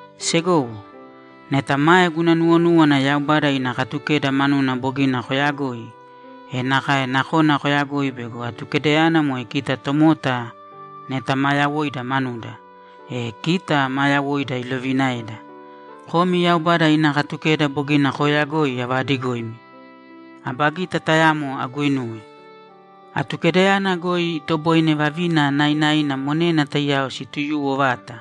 Segowo, neta mae guna nuwonúwana Yaubada ina Katukeda manuna bogina koyagoi, e nakae nakona koyagoi bego Atukedayana moe kita tomota neta ma yawoida manuda, e kita maa yawoida ilovinaeda. (Komi Yaubada ina Katukeda bogina kooyagoi avaadigoimi.) Aba gita tayamo aguinuwe. Atukedayana goi itoboine vavina nainaina monena taiyao situyuwo vata.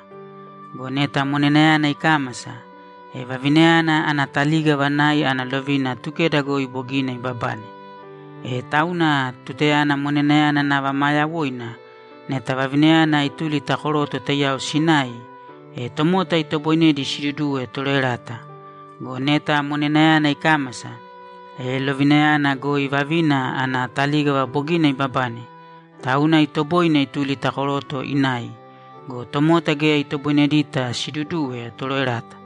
Go neta monenayana ikámasa, e vavinayana ana talígava nai ana lovina Atukeda goi bogina ibabane. E tauna tutayana monenayana nava maa yawoina, neta vavinayana ituli ta koroto taiyao sinai, e tomota itoboinedi siduduwe toroerata. Go neta monenayana ikámasa, e lovinayana goi vavina ana talígava bogina ibabane, tauna itoboine ituli ta koroto inai go, tomota geya itoboinedita siduduwe toroerata.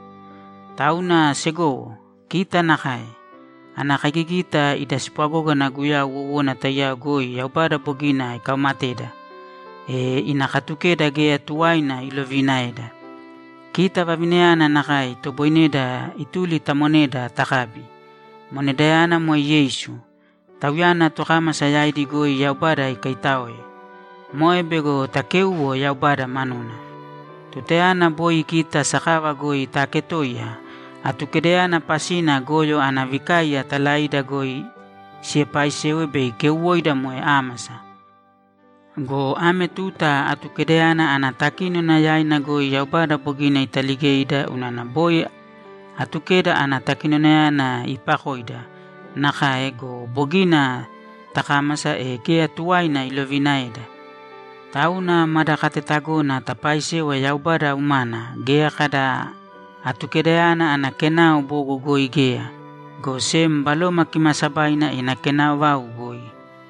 Tauna, segowo, kita nakae. Ana kaigigita ida spwagógana Guyau wowona taiyao goi Yaubada bogina ikaumateda, e ina Katukeda geya tuwaina iloviinaeda. Kita vavinayana nakae itoboineda ituli ta moneda takabi. Monedayana moe Yeisu, Tauyana tokámasa yaidi goi Yaubada ikaitáoe. Moe bego takéuwo Yaubada manuna. Tutayana boi kita sakava goi taaketoiya, Atukedayana pasina goyo ana vikaiya talaida goi sipaaisewa bei keuwoida moe ámasa. Go ame tuta Atukedayana ana takínona yaina goi Yaubada bogina italigeida unana boi Atukeda ana takinonayana iipakoida nakae go, bogina takámasa, e geya tuwaina iloviinaeda. Tauna mada katetagona tapaaisewa Yaubada umana geya kada Atukedayana ana kenao bogo goi geya, go sem Baloma Kimaasabaina ina kenao vau goi.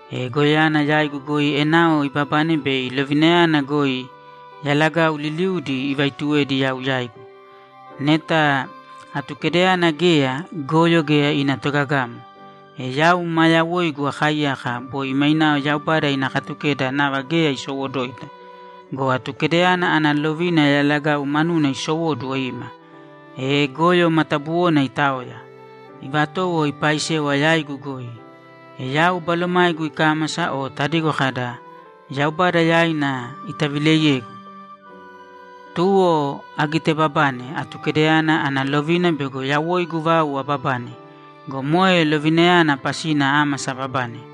E goyoyana yaigu goi enao ibabane bei lovinayana goi yalagau liliudi ivaituwedi yau yaigu. Neta Atukedayana geya, goyo geya ina togagamo. E yau maa yawoigu akaaiyaka boi mainao Yaubada ina Katukeda nava geya isowoduwoita. Go Atukedayana ana lovina yalagau manuna isowóduwo ima, e goyo matabuwona itaoya, ivatowo ipaaisewa yaigu goi. E yau balomaigu ikámasa o tadigo kada, ‘Yaubada yaina itavileiyegu.’ Tuwo agitebabane Atukedayana ana lovina bego yawoigu vau ababane go, moe lovinayana pasina ámasa ababane.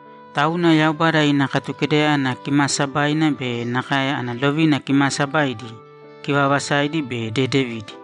Tauna Yaubada ina Katukedayana kimaasabaina be nakae ana lovina kimaasabaidi, kivaavasaidi be dedevidi.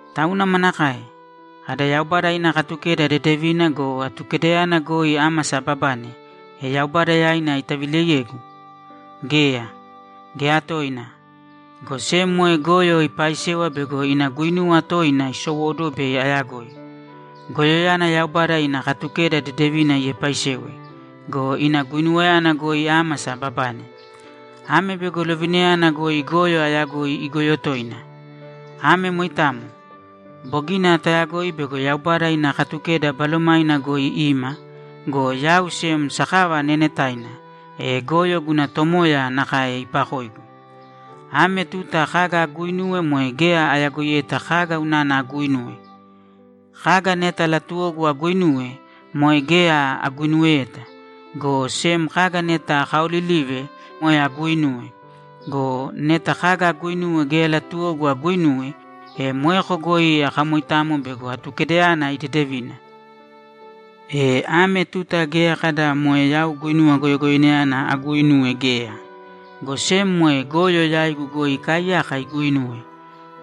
Tauna manakae? Kada, ‘Yaubada ina Katukeda dedevina go, Atukedayana goi ámasa ababane, e Yaubada yaina itavileiyegu’? Geya, geya toina! Go sem moe goyo ipaaisewa bego ina guinuwa toina isowóduwo bei ayagoi. Goyoyana Yaubada ina Katukeda dedevina iepaisewe go, ina guinuwayana goi ámasa ababane. Ame bego lovinayana goi goyo ayagoi igoyo toina. Ame moitamo. Bogina tayagoi bego Yaubada ina Katukeda Balomaina goi ima go, yau sem sakava neenetaina, e goyo guna tomoya nakae ipakoigu. Ame tuta kaga aguuinuwe moe geya ayagoiyeta kaga unana aguuinuwe. Kaga neta latuwogu aguinuwe, moe geya aguinuweyeta, go sem kaga neta akaaolilive, moe aguuinuwe. Go neta kaga aguuinuwe geya latuwogu aguinuwe, e moeko goi akamoitamo bego Atukedayana idedevina. E ame tuta geya kada moe yau guinuwa goyogoyoinayana aguuinuwe geya, go sem moe goyo yaigu goi ikaaiyaka iguuinuwe.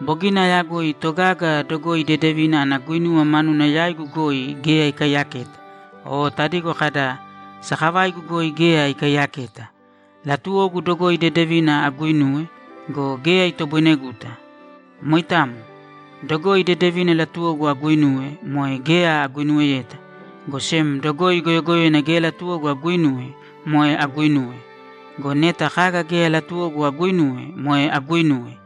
Bogina ayagoi togaga dogoi dedevina ana guinuwa manuna yaigu goi geya ikaiyaketa o tadigo kada, ‘Sakavaigu goi geya ikaiyaketa.’ Latuwogu dogoi dedevina aguinuwe go, geya itoboineguta. Moitamo. Dogoi dedevina latuwogu aguinuwe, moe geya aguinuweyeta, go sem dogoi goyogoyoina geya latuwogu aguinuwe, moe aguuinuwe. Go neta kaga geya latuwogu aguuinuwe, moe aguuinuwe,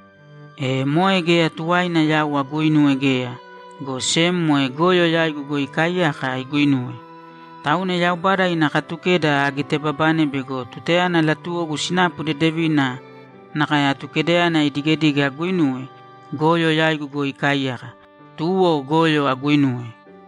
e moe geya tuwaina yau aguuinuwe geya, go sem moe goyo yaigu goi ikaaiyaka iguuinuwe. Tauna Yaubada ina Katukeda agitebabane bego tutayana latuwogu sinapu dedevina nakae Atukedayana idigedige aguinuwe, goyo yaigu goi ikaaiyaka, tuwo goyo aguinuwe.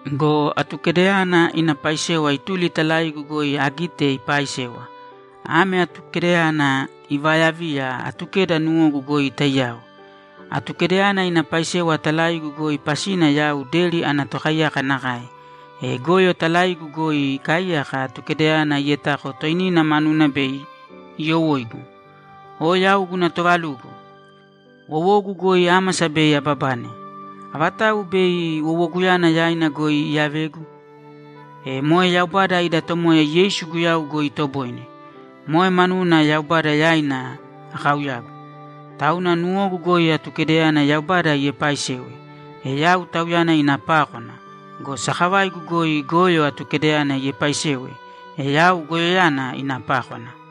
Go Atukedayana ina paisewa ituli talaigu goi agite ipaaisewa. Ame Atukedayana ivaayaviya Atukeda nuwogu goi taiyao. Atukedayana ina paisewa talaigu goi pasina yau deri ana tokaiyaka nakae, e goyo talaigu goi ikaaiyaka Atukedayana ietako toinina manuna bei iyowóigu. O yau guna toovalugo! Wowogu goi ámasa bei ababane. Avatau bei wowoguyana yaina goi iyavegu? E moe Yaubada ida Tomoya Yeisu Guyau goi itoboine. Moe manuna Yaubada yaina akauyagu. Tauna nuwogu goi Atukedayana Yaubada iepaaisewe, e yau Tauyana ina pákwana go, sakavaigu goi goyo Atukedayana iepaaisewe, e yau goyoyana ina pákwana.